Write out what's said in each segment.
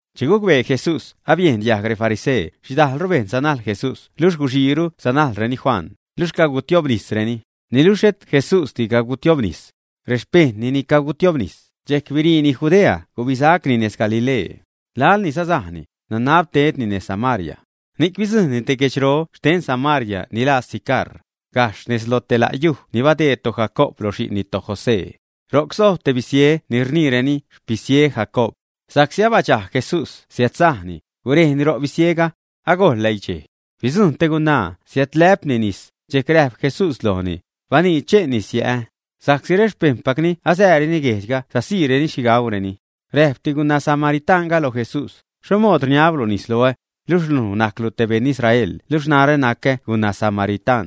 Che gucbee Jesús abiejn diajg refarisee xhidajlru bejṉ sanajl Jesús luxh guxiiru sanajlreni Juan, luxh cagutiobnisreni, (niluxh xhet Jesúsdi cagutiobnis. Rexpejṉni ni catiobnis), dxejc biriini Judea gubisacni nez Galilee. Laḻ ni sasajni, nanab tedni nez Samaria. Ni'c bidzujṉni te guedxro xten Samaria ni laa Sicar, gajxh nejz loj te la' yuj ni badeed toJacoob lo xi'nni toJosé. Ro'c sojb te bisie ni rniireni “xpisie Jacoob”. Sa'csi abadxajg Jesús siädsajni, gurejni ro bisiega. Agojl läidxej. Bidzujṉ te gunaa siädlä'pni nis, dxejc räjp Jesús lojni: ―Baniidx che'n nis yä'ä. Sa'csi rexpejṉpacni asääreni guejdxga sasiireni xhi gaureni. Räjpti guna samaritaṉga lo Jesús: ―¿Xho mood rniablu nis loä, luj ni najc te beṉ Israel luxh narä nacä gunaa samaritaṉ?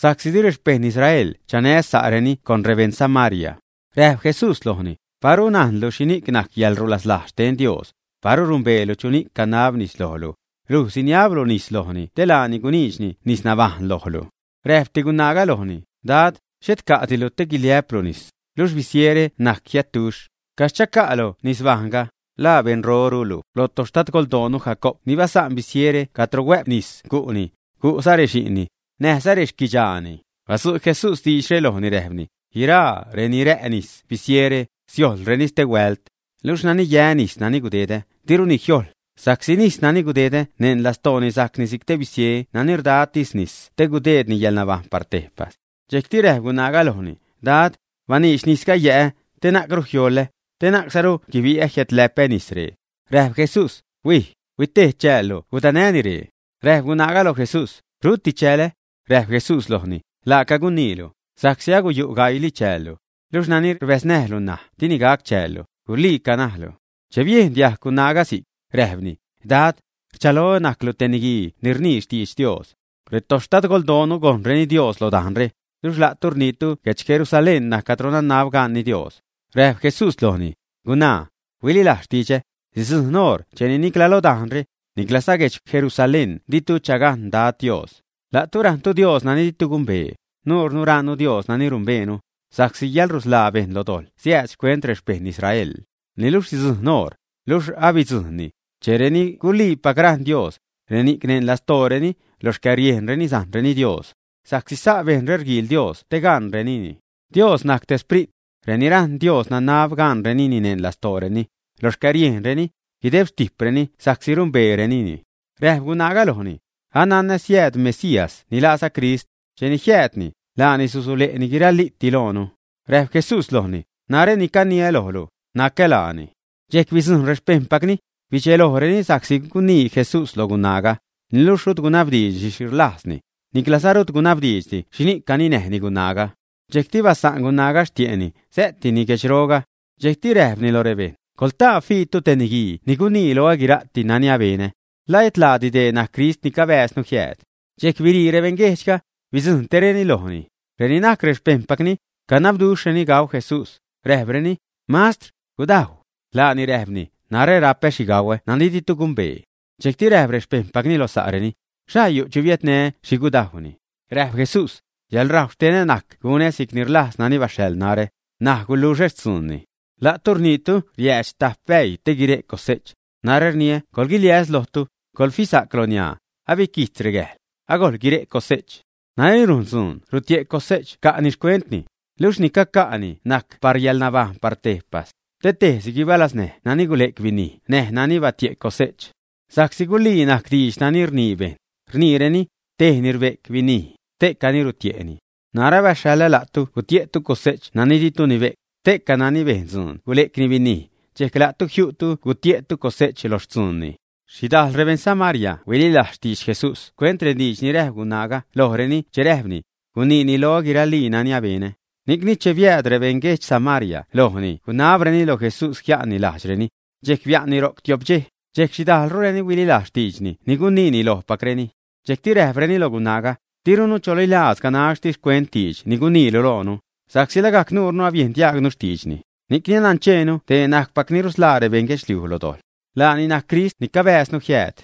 (Sa'csi di rexpejṉ Israel chanä sa'reni rebejṉ Samaria.) Räjp Jesús lojni: ―Paru najnlu xhini'c najc yäḻrulaslajz xten Dios, paru numbeelu chuni'c canab nis lojlu, luj siniablu lojni te laani guniidxni nisnabajṉ lojlu. Räjpti gunaaga lojni: ―Dad, xhet ca'dilu te guiliä'plu nis, luxh bisiere najc jiätduxh. ¿Caxh chaca'lu nisnabajṉga, ä? ¿La beṉrorulu lo toxtadgoldoonu Jacoob ni basa'n bisiere cadro huä'p nis gu'ni, gu'za rexi'nni, näjza rexquidxaani, ä? Badzu' Jesús diidxre lojni, räjpni: ―Guiraa reni rä' nis bisiere, siojlreni stehuält. Luxh nani yä nis nani gudedä, diruni jiojḻ, sa'csi nis nani gudedä neṉ lastooni sajcni si'c te bisie nani rdatis nisni te gudeedni yäḻnabajṉ par tejpas. Dxejcti räjp gunaaga lojni: ―Dad, baniidx nisga yä'ä, te na'cru jioḻä, te na'cruza guibi'ä jiädlä'pä nis ree. Räjp Jesús: ―Huij, huitejdx chäälu gudanäni ree. Räjp gunaa loj Jesús: ―Ruti chälä. Räjp Jesús lojni: ―Laaca guniilu, sa'csi aguyu' gaiili chäällu. Luxh nani rbäznäjlu ṉaj dini gac chäällu; guliica najlu. Che biejn diajg gunaaga si'c, räjpni: ―Dad, rchaloä najclu te niguii ni rnii xtidx Dios. Retoxtadgoldoonu gojṉreni Dios lo dajnre, luxh la'tu rniitu guedx Jerusalén najc cadro nanab ganni Dios. Räjp Jesús lojni: ―Gunaa, huililajz xtidxä, sidzujṉ oṟ cheni nicla lo dajnre, niclaza guedx Jerusalén ditu chagajṉ Dad Dios. La'tu rajṉtu Dios nani ditu gumbee, nuunu rajṉnu Dios nani rumbeenu; sa'csi yäḻrusḻaa bejṉ lo dojḻ siääd xcuent rexpejṉ Israel. Niluxh sidzujṉ oṟ, luxh alabidzujṉni, che reni guliipac rajṉ Dad, reni'c neṉ lastooreni, lo xcäriejnreni sajṉreni Dios. Sa'csi sa' bejṉre rguiil Dad Dios te gaṉrenini. Dios najc te Sprit. Reni rajṉ Dios nanab gaṉrenini neṉ lastooreni, lo xcäriejnreni, guideb xtijpreni sa'csi rumbeerenini. Räjp gunaa lojni: ―Ananä siääd Mesías ni laaza Crist. Cheni jiäädni, laani susule'ni guiraliiti loonu. Räjp Jesús lojni: ―Narä ni caniä lojlu, nacä laani. Dxejc bidzujṉ rexpejṉpacni, bidxelojreni sa'csi gunii Jesús lo gunaaga, niluxh rut gunabdiidxdi xhi rlajzni, niclaza rut gunabdiidxdi xhini'c caninäjni gunaaga. Dxejcti basa'n gunaaga xtie'ni, sä'tini guedxroga. Dxejcti räjpni loj rebejṉ: ―Coḻtaa, fiitu te niguii ni gunii loä guira'ti nani abenä. ¿La et laadi dee Crist ni cabääznu jiääd, ä? Dxejc birii rebejṉguejdxga, bidzujṉtireni lojni. Reni najc rexpejṉpacni canabduxhreni gau Jesús, räjpreni: ―Mastr, gudajw. Laani räjpni: ―Narä rapä xhi gauä nani ditu gumbee. Dxejcti räjp rexpejṉpacni lo sa'reni: ―¿Xhaa yu' chu abiädnä xhi gudajwni, ä? Räjp Jesús: ―Yäḻrajw xtenä najc gunä si'cni rlajz nani baxhaḻ narä, näj guluxä xtzuunni. La'tu rniitu riäädx tajp bäii te guire' cose'ch. Narä rniä coḻguiliäs lojtu, coḻfisa'c loniaa, abiquijtz regäjḻ, agojḻ guire' cose'ch. Nani rujn dzuun rutie' cose'ch rca'ni xcuentni, luxh ni caca'ni najc par yäḻnabajṉ par tejpas, te tejsi guibalaznäj nani gule'c binij näj nani batie' cose'ch. Sa'csi gulii najc diidx nani rnii bejṉ, rniireni: “Tejni rbe'c binij, ste'cani rutie'ni.” Narä abaxhaḻä la'tu gutie'tu cose'ch nani ditu nibe'c; ste'ca najc nani bejn dzuun gule'cni binij, dxejc la'tu jiu'tu gutie'tu cose'ch loj xtzuunni. Xhidajl rebeṉ Samaria huililajz xtidx Jesús xcuent rediidx ni räjp gunaaga lojreni che räjpni: “Guniini loä guiralii nani abenä.” Ni'cni, che biääd rebeṉ guedx Samaria lojni gunabreni loj Jesús jia'nni lajdxreni. Dxejc bia'nni ro'c tio'p dxej. Dxejc xhidajlrureni huililajz xtiidxni ni guniini lojpacreni. Dxejcti räjpreni loj gunaaga: ―Dirunu chalilajz ganaxtis xcuent diidx ni guniilu loonu, sa'csi lagajc nuure abiejn diajgnu xtiidxni, ni'c nancheenu dee najcpac ni rusḻaa rebejṉ guedxliuj loj dojḻ. Laani najc Crist ni cabääznu jiääd.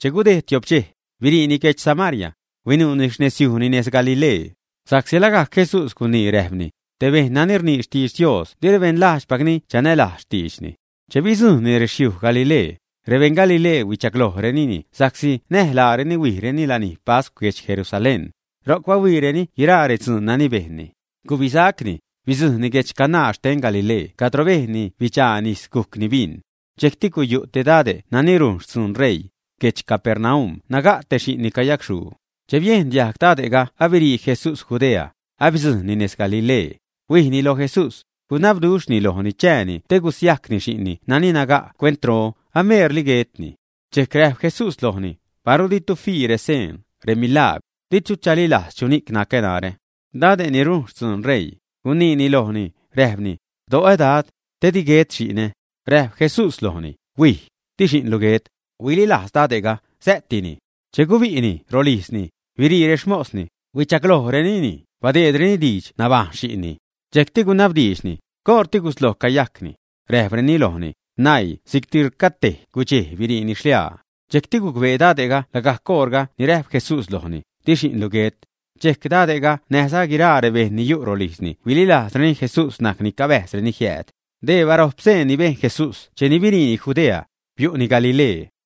Che gudejd tio'p dxej, biriini guedx Samaria, huinuuni xnezyujni nez Galilee. Sa'csi lagajc Jesús gunii, räjpni: Te bejṉ nani rnii xtidx Dios di rebeṉ lajdxpacni chanälajz xtiidxni. Che bidzujṉni rexyuj Galilee, rebeṉ Galilee huichaglojrenini sa'csi näj laareni huijreni lanij pascw guedx Jerusalén, ro'c bahuiireni guiraa redzuun nani bejnni. Gubisacni, bidzujṉni guedx Caná xten Galilee cadro bejnni bidxaa nis gujcni bin. Dxejcti guyu' te dade' nani rujn xtzuun ṟeii. Guedx Capernaum naga' te xi'nni cayacxhuu. Che biejn diajg dade'ga abirii Jesús Judea, abidzujṉni nez Galilee, huijni lo Jesús, gunabduxhni lojni chääni te gusiajcni xi'nni nani naga' cuentro, ameerli guetni. Dxejcti räjp Jesús lojni: ―Paru ditu fii reseen, remilagwr, ditu chalilajz chuni'c nacä narä. Dade' ni rujn xtzuun ṟeii, gunii lojni, räjpni: ―Do'o Dad, te di guet xi'nä. Räjp Jesús lojni: ―Huij. Di xi'nlu guet. Huililajz dade'ga, sä'tini. Che gubi'ni rolijzni, birii rexmosni, huichaglojni, badeedreni diidx nabajṉ xi'nni. Dxejcti gunabdiidxni: ―¿Coṟti gusloj cayajcni? Räjpreni lojni: ―Naii si'cti rcatej gudxej biriini xliaa. Dxejcti gucbee dade'ga lagajc oṟga ni räjp Jesús lojni: “Di xi'nlu guet.” Dxejc dade'ga näjza guiraa rebejṉ ni yu' rolijzni huililajzreni Jesús najc ni cabäjzreni jiääd. Dee barojp seen ni bejn Jesús cheni biriini Judea, biu'ni Galilee.